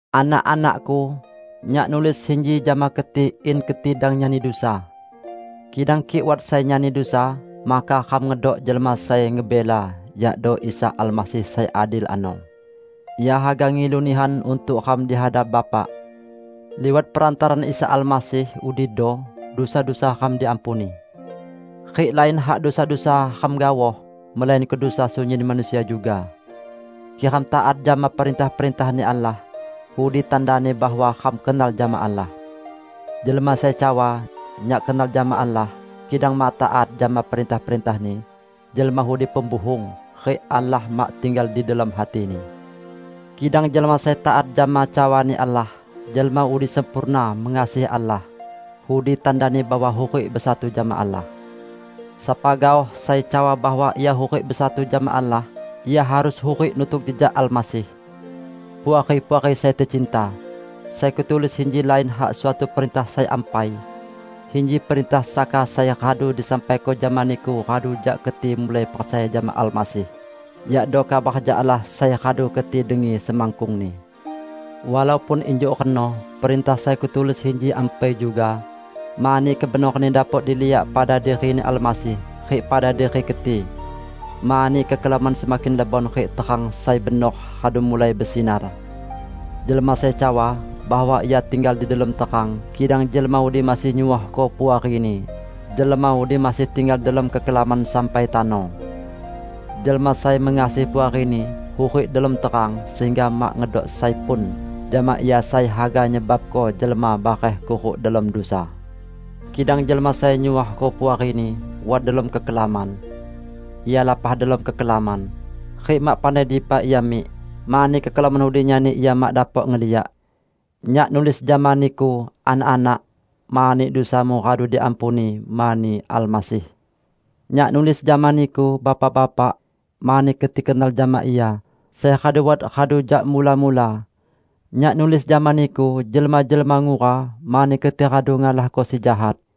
Anak-anakku! Nyak nulis sinji jama keti in keti dang nyani dusa. Kidang kik wat sai nyani dusa, maka ram ngedok jelma sai ngebela, yakdo Isa Almasih sai adil ano, Ia haga ngilu nihan untuk ram di hadap Bapa. Liwat perantaraan Isa Almasih udido dusa-dusa ram diampuni. Rik lain hak dusa-dusa ram gaoh, melainko dusa sunyin manusia juga. Kik ram taat jama perintah-perintah-Ni Allah, udi tandani bahwa ram kenal jama Allah. Jelma sai cawa, "Nyak kenal jama Allah", kidang mak taat jama perintah-perintah-Ni, jelma udi pembuhung, rik Allah mak tinggal di delom hatini. Kidang jelma sai taat jama cawa-Ni Allah, jelma udi sempurna mengasihi Allah. Udi tandani bahwa hurik besatu jama Allah. Sapa gaoh sai cawa bahwa ia hurik besatu jama Allah, ia harus hurik nutuk jejak Almasih. Puari-puari sai tecinta! Sai kutulis inji lain hak suatu perintah sai ampai. Inji perintah saka sai radu disampaiko jama niku radu jak keti mulai percaya jama Almasih; yakdo kabar jak Allah sai radu keti dengi semakkungni. Walaupun injuk reno, perintah sai kutulis inji ampai juga; mani kebenoranni dapok diliak pada diri-Ni Almasih rik pada diri keti. Mani kekelaman semakin lebon rik terang sai benor radu mulai besinar. Jelma sai cawa bahwa ia tinggal di delom terang kidang jelma udi masih nyuohko puarini, jelma udi masih tinggal delom kekelaman sampai tano. Jelma sai mengasihi puarini, hurik delom terang sehingga mak ngedok sai pun jama ia sai haga nyebabko jelma bareh kuruk delom dusa. Kidang jelma sai nyuohko puarini, wat delom kekelaman. Ia lapah delom kekelaman, rik mak pandai dipa ia mik, mani kekelaman udi nyani ia mak dapok ngeliak. Nyak nulis jama niku, Anak-anak, mani dusamu radu diampuni mani Almasih. Nyak nulis jama niku, Bapak-bapak, mani keti kenal jama Ia sai radu wat radu jak mula-mula. Nyak nulis jama niku, Jelma-jelma ngura, mani keti radu ngalahko Si Jahat.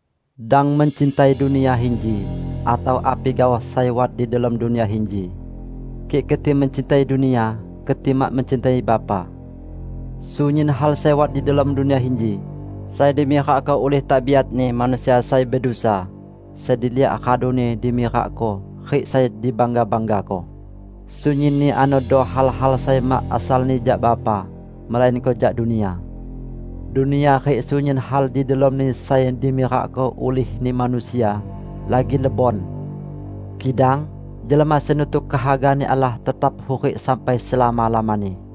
Dang mencintai dunia inji atau api gaoh sai wat di delom dunia inji. Kik keti mencintai dunia, keti mak mencintai Bapa. Sunyin hal sai wat di delom dunia inji -- sai dimirakko ulih tabiatni manusia sai bedusa, sai diliak raduni dimirakko rik sai dibangga-banggako -- sunyinni anodo hal-hal sai mak asalni jak Bapa, melainko jak dunia. Dunia rik sunyin hal di delomni sai dimirakko ulihni manusia, lagi lebon. Kidang jelma sai nutuk kehaga-Ni Allah tetap hurik sampai selama-lamani.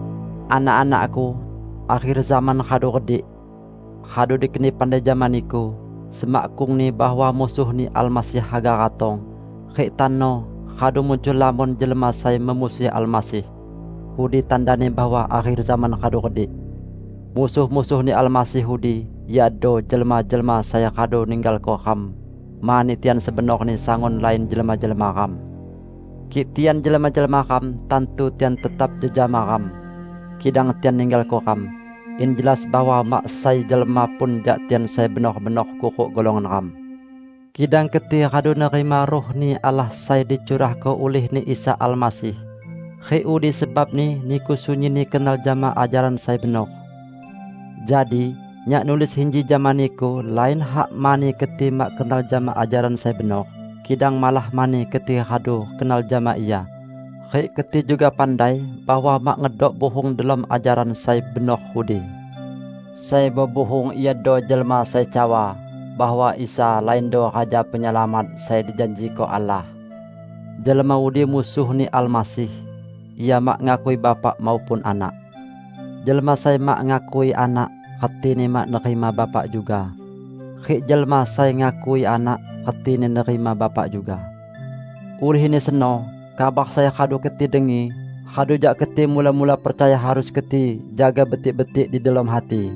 Anak-anakku, akher zaman radu redik! Radu dikeni pandai jama niku semakkungni bahwa Musuh-Ni Almasih haga ratong; rik tano radu muncul lamon jelma sai memusuhi Almasih. Udi tandani bahwa akher zaman radu redik. Musuh-musuh-Ni Almasih udi iado jelma-jelma sai radu ninggalko ram, mani tian sebenorni sangun lain jelma-jelma ram. Kik tian jelma-jelma ram, tantu tian tetap jejama ram. Kidang tian ninggalko ram, in jelas bahwa mak sai jelma pun jak tian sai benor-benor kuruk golongan ram. Kidang keti radu nerima Ruh-Ni Allah sai dicurahko ulih-Ni Isa Almasih rik udi sebabni niku sunyinni kenal jama ajaran sai benor. Jadi nyak nulis inji jama niku lain hak mani keti mak kenal jama ajaran sai benor, kidang malah mani keti radu kenal jama ia, rik keti juga pandai bahwa mak ngedok buhung delom ajaran sai benor udi. Sai bebuhung iado jelma sai cawa bahwa Isa laindo Raja Penyelamat sai dijanjiko Allah. Jelma udi Musuh-Ni Almasih; ia mak ngakui Bapa maupun Anak. Jelma sai mak ngakui Anak retini mak nerima Bapa juga. Rik jelma sai ngakui Anak, retini nerima Bapa juga. Ulihni seno, kabar sai radu keti dengi radu jak keti mula-mula percaya harus keti jaga betik-betik di delom hati.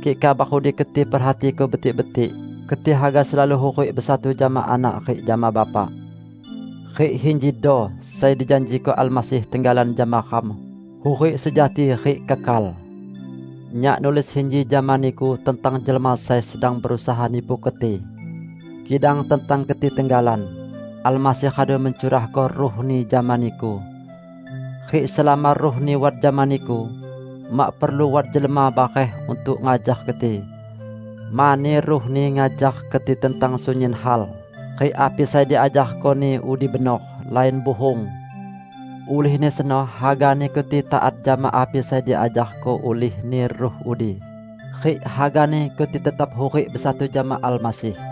Kik kabar udi keti perhatiko betik-betik, keti haga selalu hurik besatu jama Anak rik jama Bapa. Rik injido sai dijanjiko Almasih tenggalan jama ram: hurik sejati rik kekal. Nyak nulis inji jama niku tentang jelma sai sedang berusaha nipu keti. Kidang tentang keti tenggalan, Almasih radu mencurahko Ruh-Ni jama niku. Rik selama Ruh-Ni wat jama niku, mak perlu wat jelma bareh untuk ngajar keti. Mani Ruh-Ni ngajar keti tentang sunyin hal; rik api sai diajarko-Ni udi benor, lain buhung. Ulihni seno, hagani keti taat jama api sai diajarko ulih-Ni Ruh udi, rik hagani keti tetap hurik besatu jama Almasih.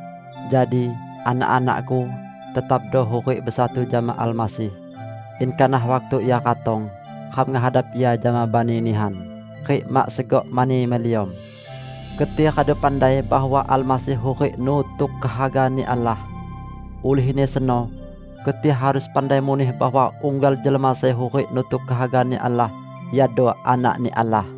Jadi, anak-anakku, tetapdo hurik besatu jama Almasih, in kanah waktu Ia ratong, ram ngehadap Ia jama bani nihan, rik mak segok mani meliom. Keti radu pandai bahwa Almasih hurik nutuk kehaga-Ni Allah. Ulihni seno keti harus pandai muneh bahwa unggal jelma sai hurik nutuk kehaga-Ni Allah iado anak-Ni Allah.